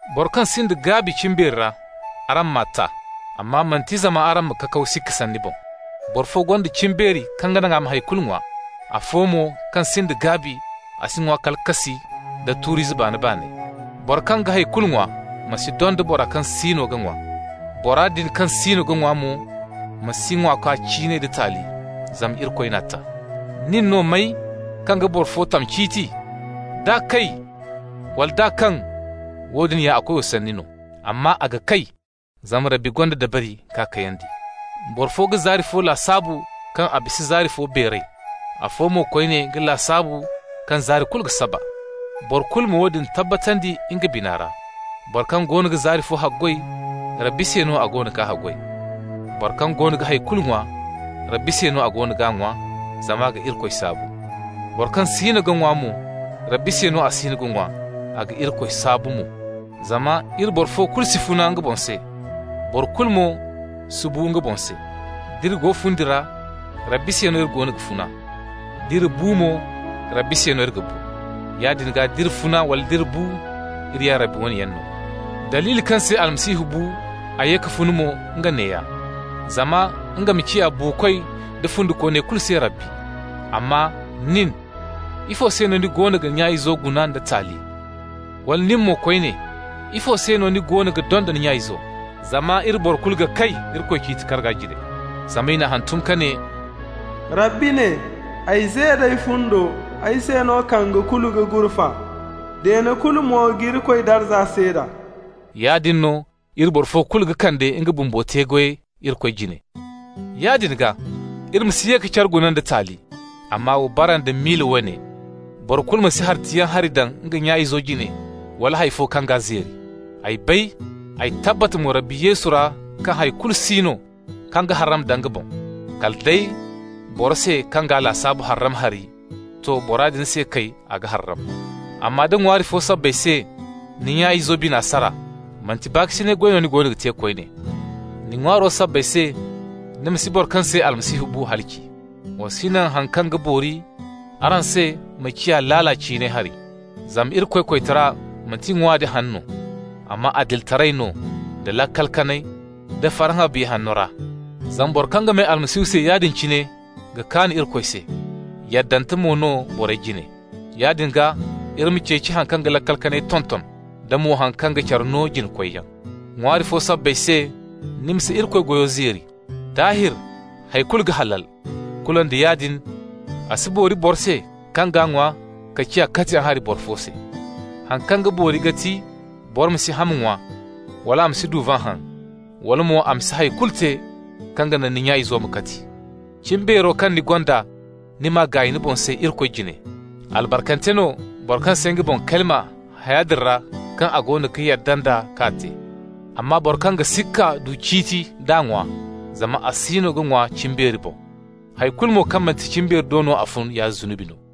Boro kaŋ sinda gaabi cimbeeri ra, araŋ m'a ta, amma manti zama araŋ ma kakaw sikka sanni boŋ. Boro fo gonda cimbeeri kaŋ ga naŋ a ma hay kulu ŋwa. Afo mo, kaŋ sinda gaabi, a si ŋwa kala kassi nda tuuri izey baano-baaney. Boro kaŋ ga hay kulu ŋwa ma si donda bora kaŋ siino ga ŋwa. Bora din kaŋ siino ga ŋwa mo ma si ŋwaakwa ciinay da taali, zama Irikoy n'a ta. Nin no may kaŋ ga boro fo tam ciiti? D'a kay wala nd'a kaŋ, woodin a koyo sanni no. Amma a ga kay, zama Rabbi gonda dabari k'a kayandi. Boro fo ga zaari fo lasaabu kaŋ a bisa zaari fo beeray. Afo mo koyne ga lasaabu kaŋ zaari kulu ga saba. Boro kulu ma woodin tabbatandi nga bina ra. Boro kaŋ goono ga zaari fo haggoy, Rabbi se no a goono g'a haggoy. Boro kaŋ goono ga hay kulu ŋwa, Rabbi se no a goono g'a ŋwa, zama a ga Irikoy saabu. Boro kaŋ siino ga ŋwa mo, Rabbi se no a siino ga ŋwa, a ga Irikoy saabu mo. Zama iri boro fo kulu si funa nga boŋ se, boro kulu mo si bu nga boŋ se. D'iri go fundi ra, Rabbi se no iri goono ga funa. D'iri bu mo, Rabbi se no iri ga bu. Yaadin gaa d'iri funa wala nd'iri bu, iri ya Rabbi wane yaŋ no. Daliili kaŋ se Almasihu bu, a ye ka funa mo, nga neeya: zama nga ma ciya buukoy da fundikooney kulu se Rabbi. Amma nin: ifo se no ni goono ga ni nya-izo guna nda taali? Wala ni mo koyne: ifo se no ni goono ga donda ni nya-izo? Zama iri boro kulu ga kay Irikoy ciiti karga jine! Zama i n'a hantum ka ne: Rabbi ne: «Ay ze d'ay fundo, ay se no kange kulu ga gurfa. Deene kulu mo ga Irikoy darza seeda.» Yaadin no, iri boro fo kulu ga kande nga bumbo te-goyey Irikoy jine. Yaadin gaa, iri ma si ye ka care guna nda taali. Amma wa bara nda miila woone: boro kulu ma si hartayaŋ hari daŋ nga nya-izo jine, wala hay fo kaŋ g'a zeeri. Ay bay, ay tabbat mo Rabbi Yesu ra kaŋ hay kulu si no kaŋ ga harram da nga boŋ. Kala day, boro se kaŋ g'a lasaabu harram hari, to, bora din se kay, a ga harram. Amma nda ŋwaari fo sabbay se ni nya-izo bina sara, manti baakasinay goy no ni goono ga te koyne. Ni ŋwaaro sabbay se ni ma si boro kaŋ se Almasihu bu halaci. Wa si naŋ haŋ kaŋ ga boori araŋ se ma ciya laala ciinay hari. Zama Irikoy koytara manti ŋwa da haŋ no, amma adilitaray no, da laakal kanay, da farhã Biya Hanno ra. Zama boro kaŋ ga may Almasihu se yaadin cine ga kaan Irikoy se, yaddante mo no borey jine. Yaadin gaa, iri ma ceeci haŋ kaŋ ga laakal kanay tonton, da mo haŋ kaŋ ga care no jina-koyyaŋ. }waari fo sabbay se ni ma si Irikoy goyo zeeri. Daahir, hay kulu ga halal. Kulu nda yaadin a si boori boro se kaŋ g'a ŋwa ka ciya katiyaŋ hari boro fo se. Haŋ kaŋ ga boori ga ti boro ma si ham ŋwa, wala a ma si duvan haŋ, wala mo a ma si hay kulu te kaŋ ga naŋ ni nya-izo ma kati. Cimbeero kaŋ ni gonda, ni m'a gaay ni boŋ se Irikoy jine. Albarkante no boro kaŋ si nga boŋ kalima haya din ra kaŋ a goono ga yadda nd'a ka te. Amma boro kaŋ ga sikka du ciiti d'a ŋwa, zama a siino ga ŋwa cimbeeri boŋ. Hay kulu mo kaŋ manti cimbeeri do no a fun ya zunubi no.